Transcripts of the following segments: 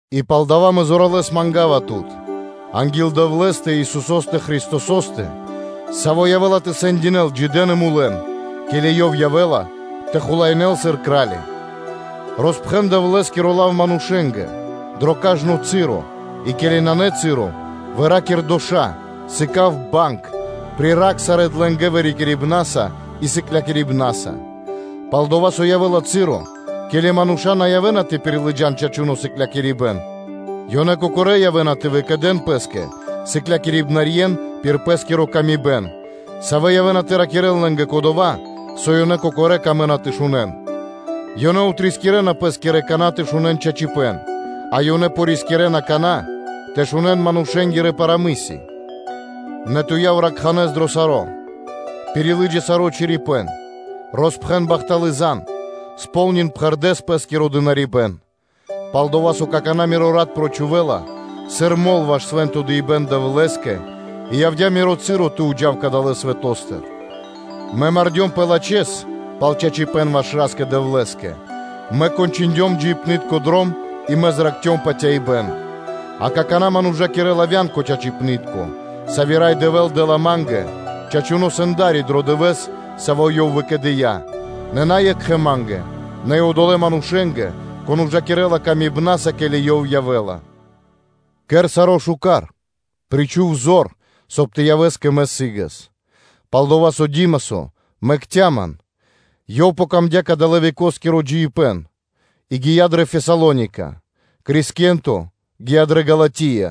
И палдава́ мэ зоралэ́с манга́ва тут анги́л Дэвлэ́стэ и Исусо́стэ Христосо́стэ, Саво́ явэ́ла тэ сэндякирэ́л джидэн и мулэн, ке́ли Ёв явэ́ла тэ хулаинэ́л сыр Кра́ли, роспхэн Дэвлэ́скиро лав манушэ́нгэ, дро кажно часо и ке́ли нанэ часо, выракир доша́, сыка́в банг, приракх сарэ́ длэнгэ вырикирибнаса и сыклякирибнаса. Палдава́ со явэ́ла часо, ке́ли мануша́ на явэ́на тэ пирилыджан чачуно́ сыклякирибэ́н, ёнэ кокорэ́ явэ́на тэ выкэдэн пэ́скэ сыклякирибнаскирэн пир пэ́скири годы́, савэ́ явэнэ тэ ракирэ́н лэ́нгэ кодова́, со ёнэ кокорэ́ камэ́на тэ шунэ́н. Ёнэ отрискирэна пэ́скирэ кана́ тэ шунэ́н чачипэ́н, а ёнэ рискирэна кана́ тэ шунэ́н манушэ́нгирэ парамыси. Нэ ту яв ракхуно́ дро саро́, пирилыджа саро́ чорипэ́н, роспхэн бахталы́ зан (звесь), кэр пхэрдэ́с пэ́скиро дынарибэ́н. Пал-дова́ со какана́ миро рат прочхувэла, сыр мол ваш свэ́нто дыибэ́н Ра́скэ-Дэвлэ́скэ и явдя́ миро часо тэ уджав кадалэ́ свэто́стыр. Мэ мардёмпэ лачхэ́с пал чачипэ́н ваш Ра́скэ-Дэвлэ́скэ, мэ кончиндём джиибнытко дром, и мэ зракхцём патяибэ́н. А какана́ ман ужакирэ́ла вя́нка чачипнытко, сави́ Рай Дэвэ́л дэ́ла ма́нгэ, чачуно́ Сэнда́ри дро Дывэ́с, саво́ Ёв выкэдыя́, нэ на екхэ ма́нгэ, нэ и одолэ́ манушэ́нгэ, кон ужакирэ́ла откэрдэ илэ́са, ке́ли Ёв явэ́ла. Кэр саро́ шука́р, причху́в зор, соб (кай) тэ явэс кэ мэ сы́гэс; пал-дова́ со Димасо мэкця́ ман, лэ́скэ яця́ дро́го кадалэ́ – векоскиро джиибэ́н, и ёв гия́ дрэ Фесалоника, Крискенто гия́ дрэ Галатия,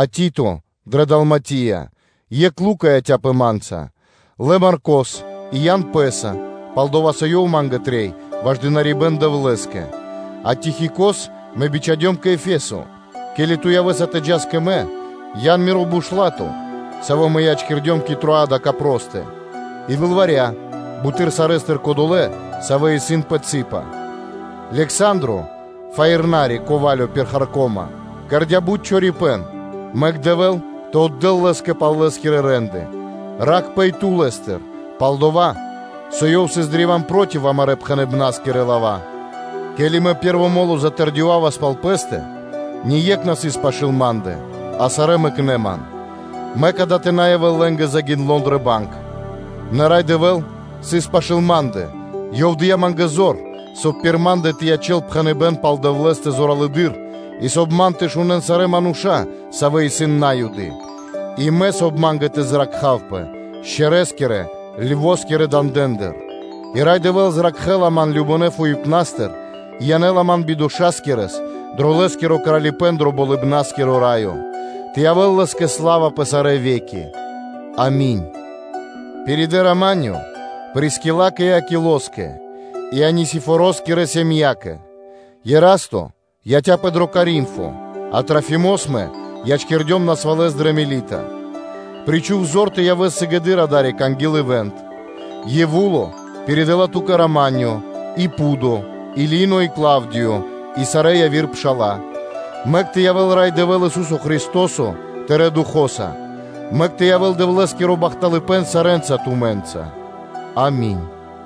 а Тито дрэ Далматия. Екх Лука яця́пэ ма́нца. Лэ Маркос и ян пэ́са, пал-дова́ со ёв ма́нгэ трэй ваш дынарибэ́н Дэвлэ́скэ. А Тихикос мэ бичхадём кэ Ефесо. Ке́ли ту явэ́са тэ джас кэ мэ, ян миро бушлато, саво́ мэ ячкирдём кэ Троада Капростэ, и лылваря, буты́р сарэ́стыр кодолэ́, савэ́ исын пэ цы́па. Лександро, фаирнари пир харко́ма (меднико), кэрдя́ бут чорипэ́н, мэк Дэвэ́л тэ отдэ́л лэ́скэ пал лэ́скирэ рэ́нды (де́лы). Ракхпэ и ту лэ́стыр, пал-дова́ со ёв сыс древа́н проти амарэ́ пхэныбнаскирэ лава́. Ке́ли мэ пэ́рво мо́ло затэрдёвавас пал пэ́стэ, ние́кх на сыс пашы́л ма́ндэ, а сарэ́ мэкнэ́ ман. Мэк дава́ тэ на явэ́л лэ́нгэ загиндло дрэ банг. Нэ Рай Дэвэ́л сыс пашы́л ма́ндэ, Ёв дыя́ ма́нгэ зор, соб (кай) пир ма́ндэ тэ ячэ́л пхэныбэ́н пал Дэвлэ́стэ зоралэды́р и соб (кай) ман тэ шунэ́н сарэ́ мануша́, савэ́ исын На́юды, и соб (кай) ма́нгэ тэ зракхавпэ шчэрэ́скирэ (лево́скирэ) дандэндыр. И Рай Дэвэ́л зракхэ́ла ман кажнонэ́ фуипнастыр и янэ́ла ман бидошакирэс дро Лэ́скиро Кралипэ́н дро Болыбна́скиро Раё. Тэ явэ́л Лэ́скэ сла́ва пэ сарэ́ ве́ки. Ами́нь. Пиридэ “рама́нё” Прискилакэ и Акилоскэ и Анисифороскирэ сэмякэ. Ерасто яця́пэ дро Коринфо, а Трофимос мэ ячкирдём насвалэс дрэ Милита. Причху́в зор тэ явэс сыгэды́р адари́к анги́л ивант (зима). Евуло пиридэла ту́кэ “рама́нё”, и Пудо, и Лино, и Клавдиё, и сарэ́ яви́р пша́ла. Мэк тэ явэ́л Рай Дэвэ́л Ису́со Христо́со тырэ́ духо́са. Мэк тэ явэ́л Дэвлэ́скиро бахталыпэ́н сарэ́нца тумэ́нца. Ами́нь.